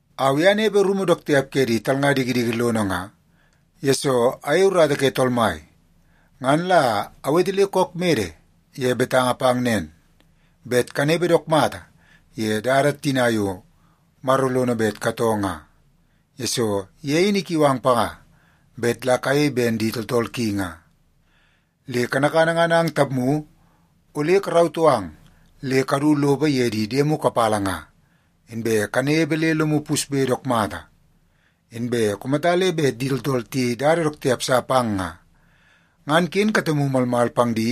Au i anepe rumu dook tiap ke di talnga dikidiki lono nga, yesoo ayei urata ke Tool Mai. Ngan la awete le kook mede ye betanga pang nen, bet kanepe dook mata ye dada tina yo Maro lono bet katoo nga, yesoo ye in ikiu ang panga bet la kayei ben di tooltool ki nga. Le kanakana ngan ang tapmu ole karautoo ang le kadu lopo ye di diemu kapala nga, inbe kanepe le lomu pusbe dook mata. Inbe kumata le bet di tooltool tiyei dada dook tiap sa pang nga, ngan ken katemu malmal pang di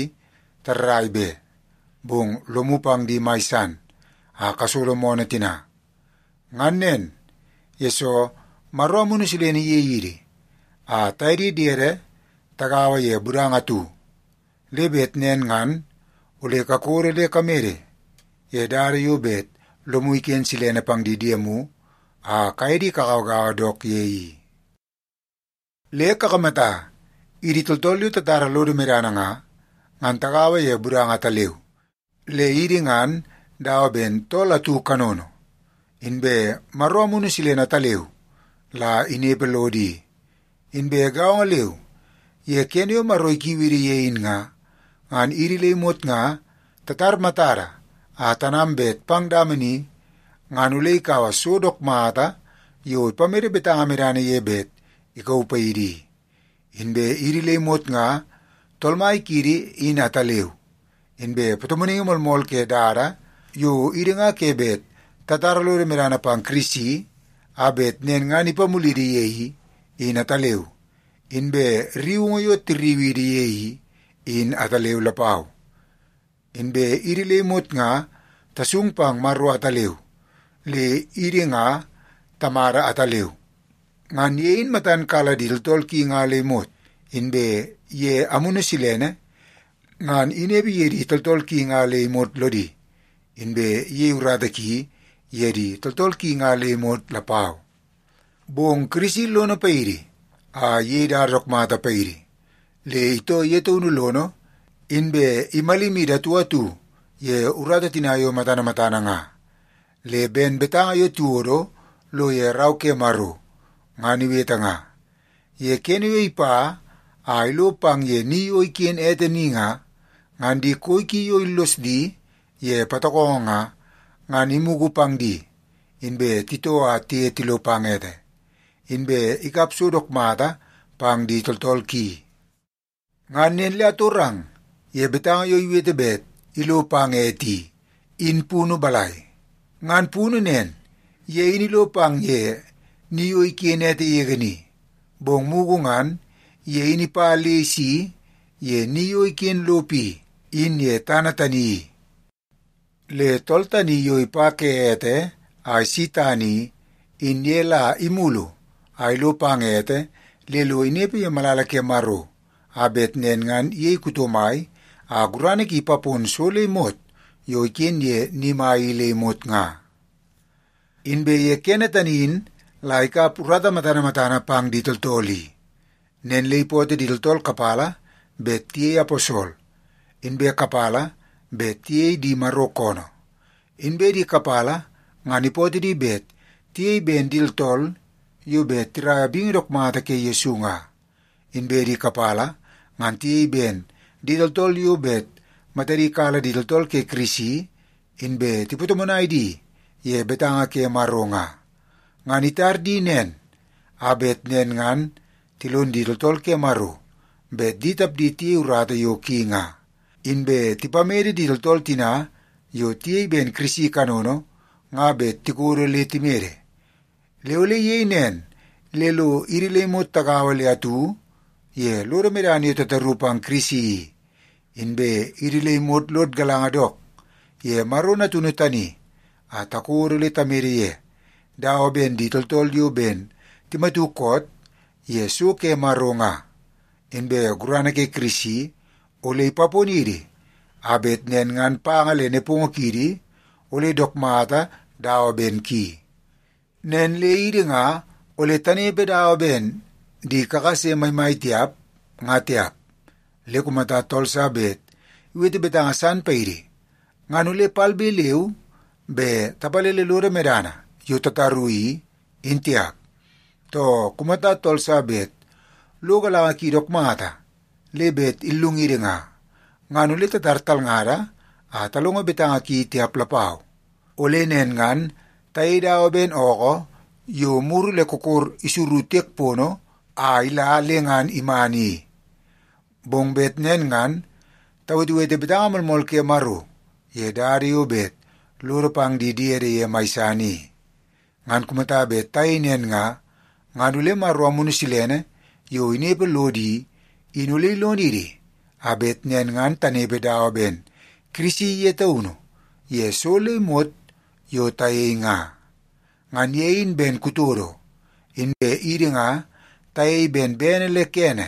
tarrai be, bong lomu pang di mai san a kasolo moonoo tina. Ngan nen, yesoo Maro Amunu Silene iyei idi a taye di diede tagaua ye budanga atu. Le bet nen ngan ole kakodo le kamede ye dada yo bet lomu iken silene pang di diemu a kaye di kagauagaua dook ye i. Le kakamata, idi tooltool yo tatara lodo medana nga, ngan tagaua ye budanga ataleu, le idi ngan dawa ben tool atu kanono. Inbe Maro Amunu Silene ataleu la inepe lodo i. Inbe gaongo leu, ye kene yo Maro ikiu idi ye in nga, ngan idi le imot nga tatar matada a tanam bet pang dama ni, ngan ole ikaua so dook mata yo ipamede betanga ye bet ikauu paidi i. Inbe idi le imot nga Tool Mai kiidi in ataleu, inbe patomonaingi moolmool ke dada yo idi nga ke bet tatara lodo medana pang Kirisi a bet nen ngan ipamulidi ye i, in ataleu, inbe rriungu yo tirriu idi ye i, in ataleu lapau. Inbe idi le imot nga tasung pang Maro ataleu, le idi nga Tamada ataleu. Ngan ye in matan kala di tooltool ki nga le imot, inbe ye Amunu Silene ngan inepe ye di tooltool ki nga le imot lodi, inbe iyei urata ki ye di tooltool ki nga le imot lapau. Bong Kirisi lono paidi a iyei dada dook mata paidi, le itoo ye taunu lono inbe imalimidi atu atu ye urata tina yo matana matana nga. Le ben betanga yo tiwodo lo ye Rau ke Maro ngan iwete nga, “Ye kene yo ipa a ilo pang ye ni yo iken ete ni nga, ngan di koi ki yo illos di ye patokongo nga, ngan imugu pang di, inbe titoo a tiye tilo pang ete, inbe ikap so dook mata pang di tooltool ki.” Ngan nen le atorang ye betanga yo iwete bet “ilo pang ete” i, in punu balai? Ngan punu nen, ye in ilo pang ye ni yo iken ete yege ni, bong mugu ngan ye in ipa le isi ye ni yo iken lopo i, in ye tana tani i. Le tool tani yo ipa ke ete a isi tana i, in ye la imulu a ilo pang ete le lo inepe ye malala ke Maro, a bet nen ngan iyei kuto mai a gurana ki ipapon so le imot yo iken ye ni mai i le imot nga. Inbe ye tani in la ikap urata matana matana pang di tooltool i. Nen le ipootoo di tooltool kapala bet tiyei aposol, inbe kapala bet tiyei di Maro koonoo. Inbe di kapala ngan ipootoo di bet tiyei ben di tooltool yo bet tiraia bingi dook mata ke Yesu nga, inbe di kapala ngan tiyei ben di tooltool yo bet matadi kala di tooltool ke Kirisi inbe tipatomonai di ye betanga ke Maro nga. Ngan itar di nen a bet nen ngan tilon di tooltool ke Maro bet di tapdi tiyei urata yo ki nga, inbe tipamede di tooltool tina yo tiyei ben Kirisi kanono nga bet tikodo le timede. Le ole iyei nen le lo idi le imot tagaua le atu ye lodo medana yo tataru pang Kirisi i, inbe idi le imot lod galanga dook ye Maro Natunu tani a takodo le tamede ye, dawa ben di tooltool yo ben timatu koot ye so ke Maro nga. Inbe gurana ke Kirisi ole ipaponidi a bet nen ngan panga le nepongo kiidi ole dook mata dawa ben ki. Nen le idi nga ole tanepe dawa ben di kakase maimai tiap, nga tiap. Le kumata tool sa bet iwete betanga san paidi, ngan ole palbe leu be tapalele lodo medana yo tataru i, in tiap. Too, kumata tool sa bet lo galanga ki dook mata le bet illungidi nga, ngan ole tatar talngada a talongo betanga ki tiap lapau. Ole nen ngan tayei dawa ben ookoo yo muru le kokor isuru tiek pono a ila le ngan iman i. Bong bet nen ngan tawetewete betanga moolmool ke Maro ye dada yo bet lodo pang di diede ye mai san i. Ngan kumata bet tayei nen nga, ngan ole Maro Amunu Silene yo inepe lodo i, in ole ilonidi a bet nen ngan tanepe dawa ben Kirisi ye taunu ye so le imot yo tayei nga. Ngan ye in ben kutodo, inbe idi nga tayei ben bene le kene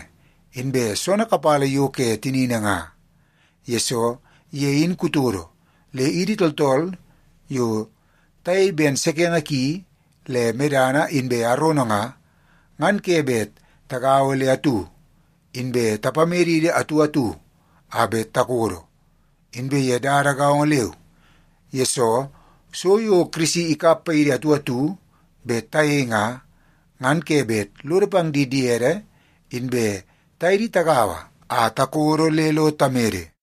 inbe soonoo kapala yo ke tinini nga. Yesoo ye in kutodo, le idi tooltool yo tayei ben sekenge ki le medana inbe arono nga, ngan ke bet tagaua le atu inbe tapamedidi atu atu a bet takodo. Inbe ye dada gaongo leu, yesoo so yo Kirisi ikap paidi atu atu bet tayei nga, ngan ke bet lodo pang di diede inbe taye di tagaua a takodo le lo tamede.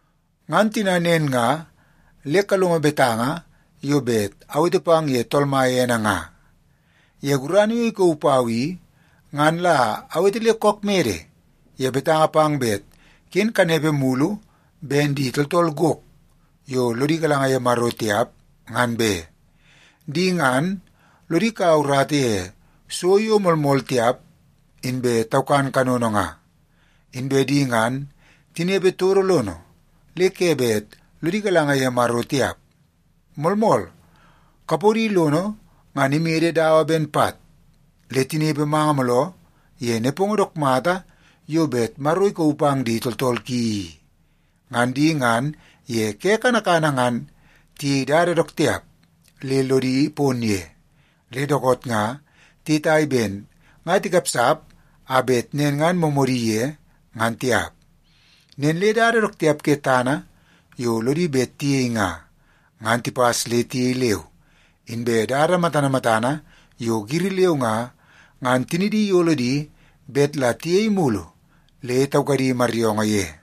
Ngan tina nen nga, le kalongo betanga yo bet awete pang ye Tool Mai ene nga! Ye gurana yo ikauu pau i, ngan la awete le kook mede ye betanga pang bet ken kanepe mulu ben di tooltool gok yo lodi galanga ye Maro tiap, ngan be. Di ngan, lodi kaua urata ye so yo moolmool tiap inbe taukan kanono nga. Inbe di ngan tinepe todo lono le ke bet lodi galanga ye Maro tiap. Moolmool, kapodi lono ngan imede dawa ben pat, le tinepe manga mooloo ye nepongo dook mata yo bet Maro ikauu pang di tooltool ki i. Ngan di ngan ye ke kanakana ngan tiyei dada dook tiap le lodi pon ye, le dookoot nga tiyetai ben nga tikapsap a bet nen ngan moomoodi ye, ngan tiap. Nen le dada dook tiap ke tana yo lodi bet tiyei nga, ngan tipas le tiyei leu. Inbe dada matana matana yo giri leu nga, ngan tinidi iyolo di bet la tiyei mulu le taukadi maryoongoo ye.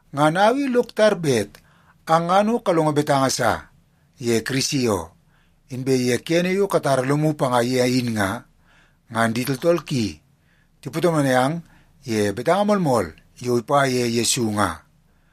Ngan au i lok tar bet ang ngan o kalongo betanga sa ye Kirisi oo, inbe ye kene yo katara lomu panga ye in nga, ngan di tooltool ki tipatomonai ang ye betanga moolmool yo ipa ye Yesu nga.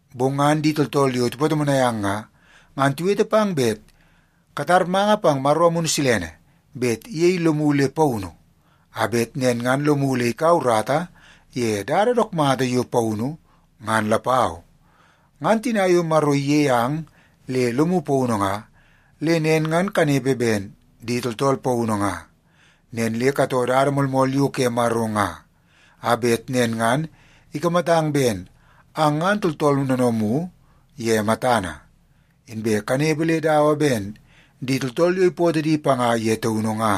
Bong ngan di tooltool yo tipatomonai ang nga, ngan tiwete pang bet katar manga pang Maro Amunu Silene bet iyei lomu le paunu a bet nen ngan lomu ole ikaua urata ye dada dook mata yo paunu ngan lapau. Ngan tina yo Maro iyei ang le lomu paunu nga, le nen ngan kanepe ben di tooltool paunu nga. Nen le katoo dada moolmool yo ke Maro nga, a bet nen ngan ikamatang ben ang ngan tooltool noonoomu ye matana, inbe kanepe le dawa ben di tooltool yo ipootoo di panga ye taunu nga.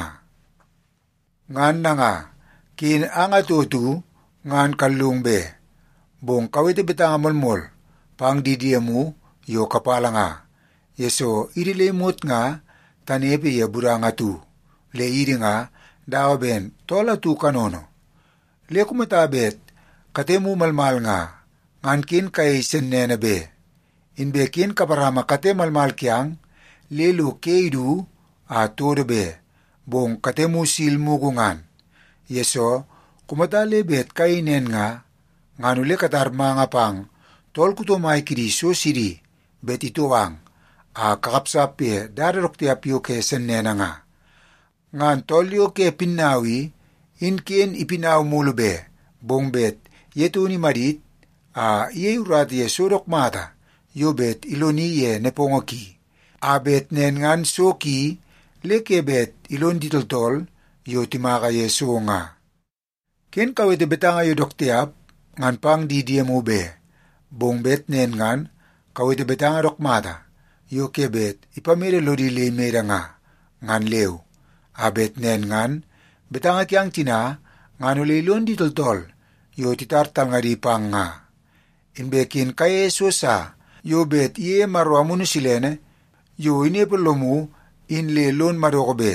Ngan nanga, ken ang atu atu ngan kallungu be, bong kawete betanga moolmool pang di diemu yo kapala nga, yesoo idi le imot nga tanepe ye budanga atu, le idi nga dawa ben tool atu kanono. Le kumata bet katemu malmal nga, ngan ken kayei sennene be. Inbe ken kaparama kate malmal kiang le lo ke idu a todo be, bong katemu sil mugu ngan, yesoo kumata le bet kayei nen nga, ngan ole katar manga pang tool kuto mai kidi so sidi bet itou ang a kakapsap ye dada dook tiap yo ke sennene nga. Ngan tool yo ke pinnau i, in ken ipinau mulu be, bong bet ye taunu imadit a iyei urata ye so dook mata yo bet iloni ye nepongo ki, a bet nen ngan so ki le ke bet ilon di tooltool yo timaka ye so nga. Ken kawete betanga yo dook tiap ngan pang di diemu be, bong bet nen ngan kawete betanga dook mata yo ke bet ipamede lodi le imede nga, ngan leu, a bet nen ngan betanga kiang tina ngan ole ilon di tooltool yo titar talngadi pang nga. Inbe ken kayeie so sa yo bet iyeie Maro Amunu Silene yo inepe lomu in le lon madoko be.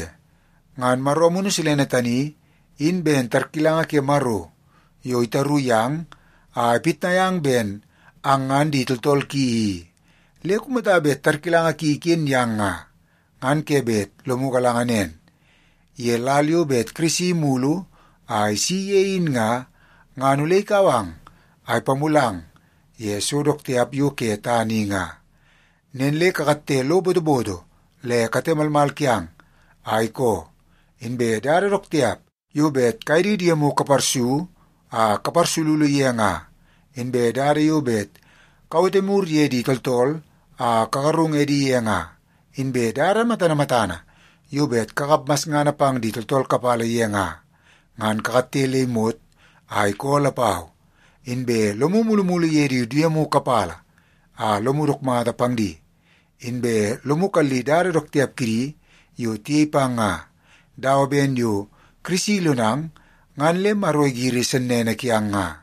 Ngan Maro Amunu Silene tani, in ben tarkilanga ke Maro yo itaru yang a ipitnai ang ben ang ngan di tooltool ki i. Le kumata bet tarkilanga ki iken yang nga, ngan ke bet lomu galanga nen, ye lal yo bet Kirisi imulu a isi ye in nga, ngan ole ikau ang a ipamulang ye so dook tiap yo ke tana i nga. Nen le kakatte lo botoboto le kate malmal kiang a ikoo. Inbe dada dook tiap yo bet kaye di diemu kaparsu a kaparsululu ye nga, inbe dada yo bet kawete mur ye di tooltool a kagarung edi ye nga, inbe dada matana matana yo bet kakap masngana pang di tooltool kapala ye nga, ngan kakatte le imot a ikoo lapau. Inbe lomu mulumulu ye di diemu kapala a lomu dook mata pang di, inbe lomu kalli dada dook tiap kidi yo tiyei pang nga, dawa ben yo Kirisi ilonang ngan le Maro igiri sennene kiang nga.